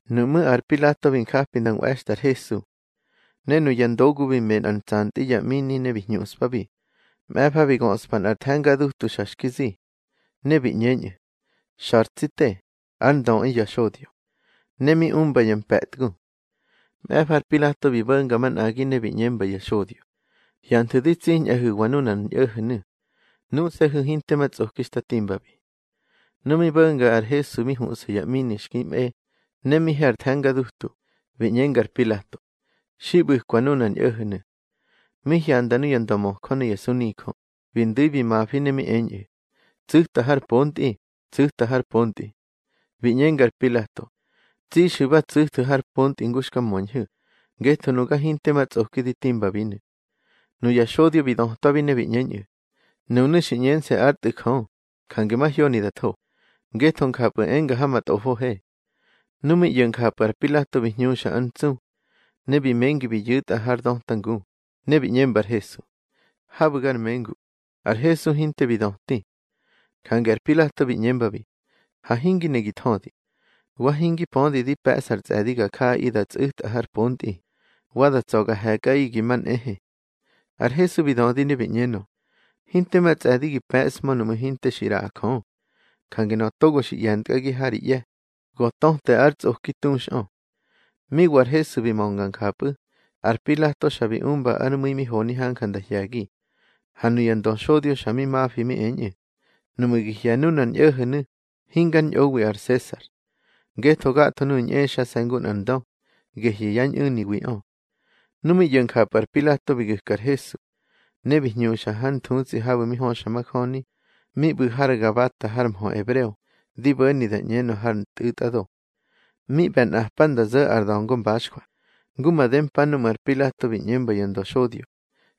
Nuꞌmú̱ ar Pilato bi japi nda nꞌwe̱xtꞌa ar Hesu. Ne nuya ndogu bi me nꞌar ntsantꞌi ya ꞌmini ne bi hñuꞌspabi. Mꞌe̱fa bi göꞌspa nꞌar the̱nga dutu xa xki zi. Ne bi ꞌñeñꞌu̱: —Xa̱ ar tsi te, ár Ndöꞌi ya xodyo. Ne mi umba ya mpe̱tgu. Mꞌe̱fa ar Pilato bi bo̱nga manꞌagi ne bi ꞌñemba ya xodyo: —Hyanthu̱ di tsiñꞌahu̱wa nunar ñꞌo̱ho̱nu̱. Nuse̱hu̱ hinte ma tsꞌoki xta timbabi. Nu mi bo̱nga ar Hesu mi huꞌsa ya ꞌmini xki mꞌe, ne mi he ar the̱nga dutu, bi ꞌñenga ar Pilato: —Xi ꞌbu̱kwa nunar ñꞌo̱ho̱nu̱. Mi hyanda nuya ndömöjö ne ya sunijö, bi ndu̱i bi mafi ne mi eñꞌu̱: —Tsu̱ta har pontꞌi, tsu̱ta har pontꞌi. Bi ꞌñenga ar Pilato: —Tsixu̱ ba tsu̱thu̱ har pontꞌi ngu xka möñhu̱, ngetho nuga hinte ma tsꞌoki di timbabinu̱. Nuya xodyo bi dötwabi ne bi ꞌñeñꞌu̱: —Nunu̱ xi ꞌñense̱ ár Tꞌu̱ Jö, jange mahyoni da tho, ngetho njapꞌu̱ enga ha ma tꞌofohe. Nu mi ꞌyo̱ njapꞌu̱ ar Pilato bi hñuxa ár ntsu. Ne bi mengi bi yu̱tꞌa har döta ngu, ne bi ꞌñemba ar Hesu: —Habu̱ gar mengu. Ar Hesu hinte bi döti. Jange ar Pilato bi ꞌñembabi: —Ha hingi ne gi thödi. Wa hingi pödi di pe̱ꞌsa ar tsꞌe̱di ga jaꞌaꞌi da tsꞌu̱tꞌa har pontꞌi, wa da tsa̱ ga he̱kꞌaꞌi gi ma nꞌehe. Ar Hesu bi dödi ne bi ꞌñenö: —Hinte ma tsꞌe̱di gi pe̱ꞌshmö nuꞌmu̱ hinte xi ꞌraꞌa Jö. Jange nöꞌö togo xi ꞌye̱ntkꞌagi ha ri ꞌye̱, go töte ár tsꞌoki tuxꞌö. Mi wa ar Hesu bi mönga njapꞌu̱, ar Pilato xa bi umba ár mu̱i mi honi hanja nda hye̱gi. Ha nuya ndöxodyo xa mi mafi mi eñꞌu̱: —Nuꞌmu̱ gi hye̱ nunar ñꞌo̱ho̱nu̱, hingár ñꞌowi ar Sesar. Ngetho gatho nuꞌu̱ ñꞌexase̱ ngu nꞌar ndö, gehyu̱ yá ñꞌu̱niwiꞌö. Nu mi ꞌyo̱ njapꞌu̱ ar Pilato bi gu̱ka ar Hesu. Ne bi hñuxa hár nthutsꞌi habu̱ höxa majöni, mi ꞌbu̱ har Gabata har mhö ebreo, di bo̱ni da ꞌñenö har Ntꞌu̱tꞌado. Mi ꞌbe̱ nꞌapa nda zo̱ ar da̱ngo mbaxjwa, ngu made mpa núꞌmu̱ ar Pilato bi ꞌñemba ya ndöxodyo: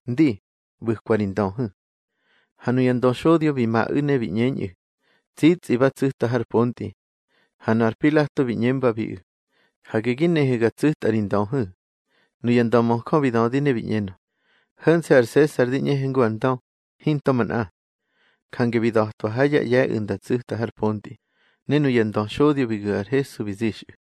—Ndi, ꞌbu̱kwa ri ndöhu̱. Ha nuya ndöxodyo bi maꞌu̱ ne bi ꞌñeñꞌu̱: —Tsitsꞌi ba tsu̱ta har pontꞌi. Ha nu ar Pilato bi ꞌñembabiꞌu̱: —Hage gi nehu̱ ga tsu̱tꞌa ri ndöhu̱. Nuya ndömöjö bi dödi ne bi ꞌñenö: —Ho̱nse̱ ar Sesar di ꞌñehe ngu ar ndö, hinto manꞌa. Jange bi da̱twa ha yá ꞌye̱ꞌu̱ nda tsu̱tꞌu̱ har pontꞌi, ne nuya ndöxodyo bi gu̱ ar Hesu bi zixꞌu̱.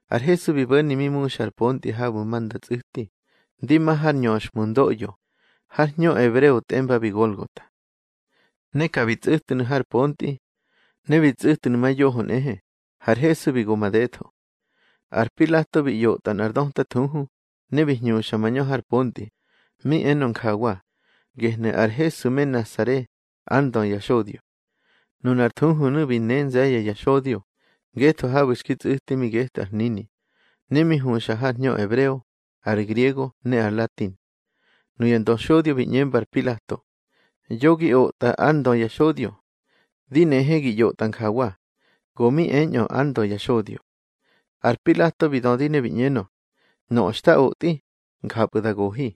Ar Hesu bi bo̱ni mi muxa ár pontꞌi habu̱ ma nda tsꞌu̱ti, ndi ma har Nñöxhmundoꞌyo, har hñö ebreo tꞌembabi Golgota. Ne ka bi tsꞌu̱tnu̱ har pontꞌi. Ne bi tsꞌu̱tnu̱ ma yoho nꞌehe, har Hesu bi go madetho. Ar Pilato bi ꞌyotꞌa nꞌar döta thuhu, ne bi hñuxa mañö ar pontꞌi, mi enö njawa: Gehnu̱ ar Hesu me Nasare, ár Ndö ya xodyo. Nunar thuhunu̱ bi ne nze̱ye̱ ya xodyo; ngetho habu̱ xki tsꞌu̱ti mi getꞌu̱ ar hnini, ne mi huxa har hñö ebreo, ar griego ne ar latin. Nuya ndöxodyo bi ꞌñemba ar Pilato: —Yo gi otꞌa: Ár Ndö ya xodyo. Di nehe gi ꞌyotꞌa njawa: Go mi eñꞌö ár Ndö ya xodyo. Ar Pilato bi dödi ne bi ꞌñenö: —Nöꞌö xta otꞌi, njapꞌu̱ da gohi.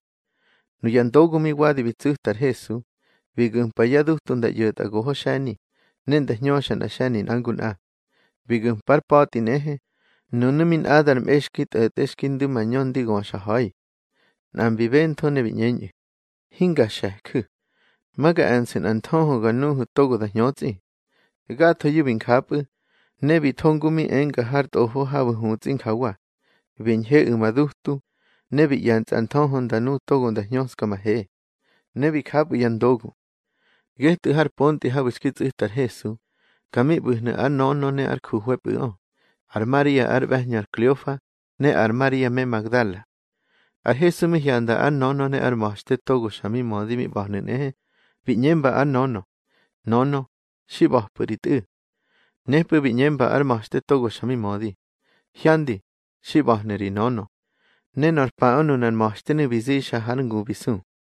Nuya ndogu mi wadi bi tsu̱ta ar Hesu, bi gu̱mpa yá dutu nda ꞌyo̱tꞌa goho xe̱ni, ne nda hñöxa nꞌa xe̱ni nꞌa ngu nꞌa. Bi gu̱mpa ár pa̱tꞌi nꞌehe, nunu̱ mi nꞌadar mꞌe xki tꞌo̱tꞌe xki ndu̱ mañö ndi göxa ha̱i. Nꞌa mbi bentho ne bi ꞌñeñꞌu̱: —Hinga xe̱ju̱. Ma ga e̱nsu̱ nꞌar nthöhö ga nuhu̱ togo da hñötsꞌi. Gathoyu̱ bi njapꞌu̱, ne bi tho ngu mi enga har Tꞌofo habu̱ hutsꞌi njawa: Bi ñheꞌu̱ ma dutu, Ne bi ꞌye̱nsa ar nthöhö nda nu togo nda hñöska ma he. Ne bi japꞌu̱ ya ndogu. Getꞌu̱ har pontꞌi habu̱ xki tsꞌu̱ta ar Hesu, ka mi ꞌba̱hnu̱ ár nönö ne ár juhwe̱pꞌu̱ꞌö, ar Maria ár ꞌbe̱hñö ar Kleofa, ne ar Maria me Magdala. Ar Hesu mi hyanda ár nönö ne ár ma̱xte togo xa mi mödi mi ꞌba̱hnu̱ nꞌehe, bi ꞌñemba ár nönö: —Nönö, xi ꞌba̱pꞌu̱ ri tꞌu̱. Nepꞌu̱ bi ꞌñemba ár ma̱xte togo xa mi mödi: —Hyandi, xi ꞌba̱hnu̱ ri nönö. Ne nor paꞌö nunar ma̱xtenu̱ bi zixa hár ngu bi su.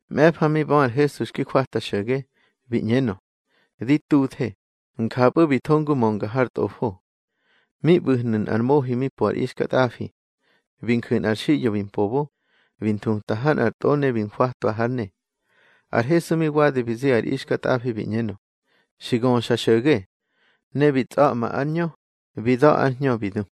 Mꞌe̱fa mi bö ar Hesu xki jwata xo̱ge, bi ꞌñenö: —Di tuthe. Njapꞌu̱ bi tho ngu mönga har Tꞌofo. Mi ꞌbu̱hnu̱ nꞌar mohi mi po ar ixkatꞌafi. Bi nju̱ nꞌar xiꞌyo bi mpobo, bi nthuta ha nꞌar tꞌo ne bi njwatwa hár ne. Ar Hesu mi wadi bi zi ar ixkatꞌafi bi ꞌñenö: —Xi göxa xo̱ge. Ne bi tsꞌa̱ꞌma ár ñö, bi da̱ ár hñö bi du.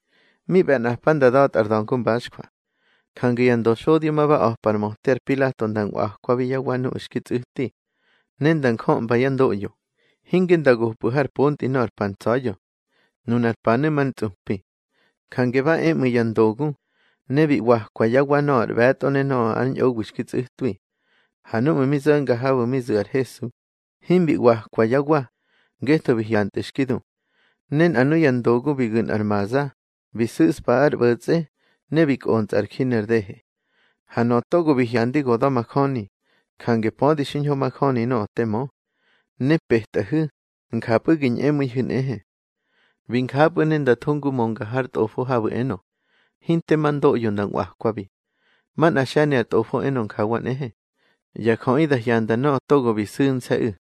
Mi ꞌbe̱ nꞌapa nda da̱tꞌa ar da̱ngo mbaxjwa. Jange ya ndöxodyo ma ba a̱pa ar möte ar Pilato nda nꞌwakwabi yá wa nuꞌu̱ xki tsꞌu̱ti. Ne nda njömba yá ndoꞌyo, hinge nda gopꞌu̱ har pontꞌi nöꞌö ar pa ntsa̱ya̱. Nunar panu̱ mar ntsꞌupi. Jange ba e ꞌmu̱ ya ndogu, ne bi ꞌwakwa yá wa nöꞌö ar ꞌbe̱tꞌo ne nöꞌö ár ñꞌowi xki tsꞌu̱twi. Ha núꞌmu̱ mi zo̱nga habu̱ mi zu̱ ar Hesu, himbi ꞌwakwa yá wa, ngetho bi hyantꞌu̱ xki du. Ne nꞌa nuya ndogu bi gu̱ nꞌar maza, bi su̱ꞌspa ár ꞌbo̱tsꞌe, ne bi kꞌontsꞌa ar ji ner dehe. Ha nöꞌö togo bi hyandi go da̱majöni, jange pödi xiñho majöni nöꞌö te mö. Ne petꞌahu̱, njapꞌu̱ gi ñꞌemu̱ihu̱ nꞌehe. Bi njapꞌu̱ ne nda tho ngu mönga har Tꞌofo habu̱ enö: Hinte ma ndoꞌyo nda nꞌwakwabi. Manꞌár xe̱ni ar Tꞌofo enö njawa nꞌehe: Ya jöꞌi da hyanda nöꞌö togo bi su̱nse̱ꞌu̱.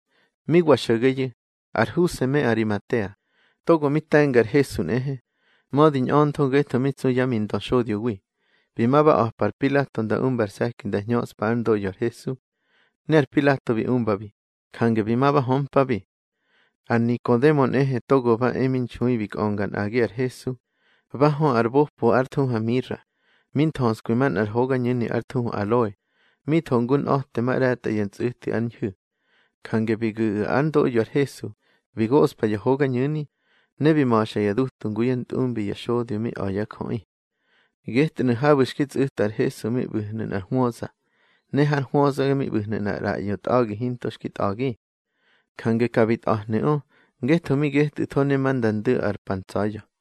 Mi wa xo̱geyu̱, ar Huse me Arimatea, togo mi te̱nga ar Hesu nꞌehe, mödi ñꞌöntho ngetho mi tsu yá mi ndöxodyowi, bi ma ba a̱pa ar Pilato nda umba ar se̱ki nda hñöꞌspa ár ndoꞌyo ar Hesu. Ne ar Pilato bi umbabi, jange bi ma ba hömpabi. Ar Nikodemo nꞌehe togo ba e mi nxui bi kꞌönga nꞌagi ar Hesu, ba hö ar bopo ár thuhu ar mira, mi nthöskwi manꞌar hogañu̱ni ár thuhu aloe, mi tho ngu nꞌa̱temaꞌre̱tꞌa ya ntsꞌu̱ti ár ñhu̱. Jange bi gu̱ꞌu̱ ár ndoꞌyo ar Hesu, bi goꞌspa ya hogañu̱ni, ne bi ma̱xa ya dutu, ngu yá ntꞌumbi ya xodyo mi a̱ yá jöꞌi. Getꞌu̱nu̱ habu̱ xki tsꞌu̱ta ar Hesu mi ꞌbu̱hnu̱ nꞌar hwöza, ne har hwöza mi ꞌbu̱hnu̱ nꞌar ꞌraꞌyo tꞌa̱gi hinto xki tꞌa̱gi. Jange ka bi tꞌa̱hnu̱ꞌö, ngetho mi getꞌu̱tho, ne ma nda ndu̱ ar pa ntsa̱ya̱.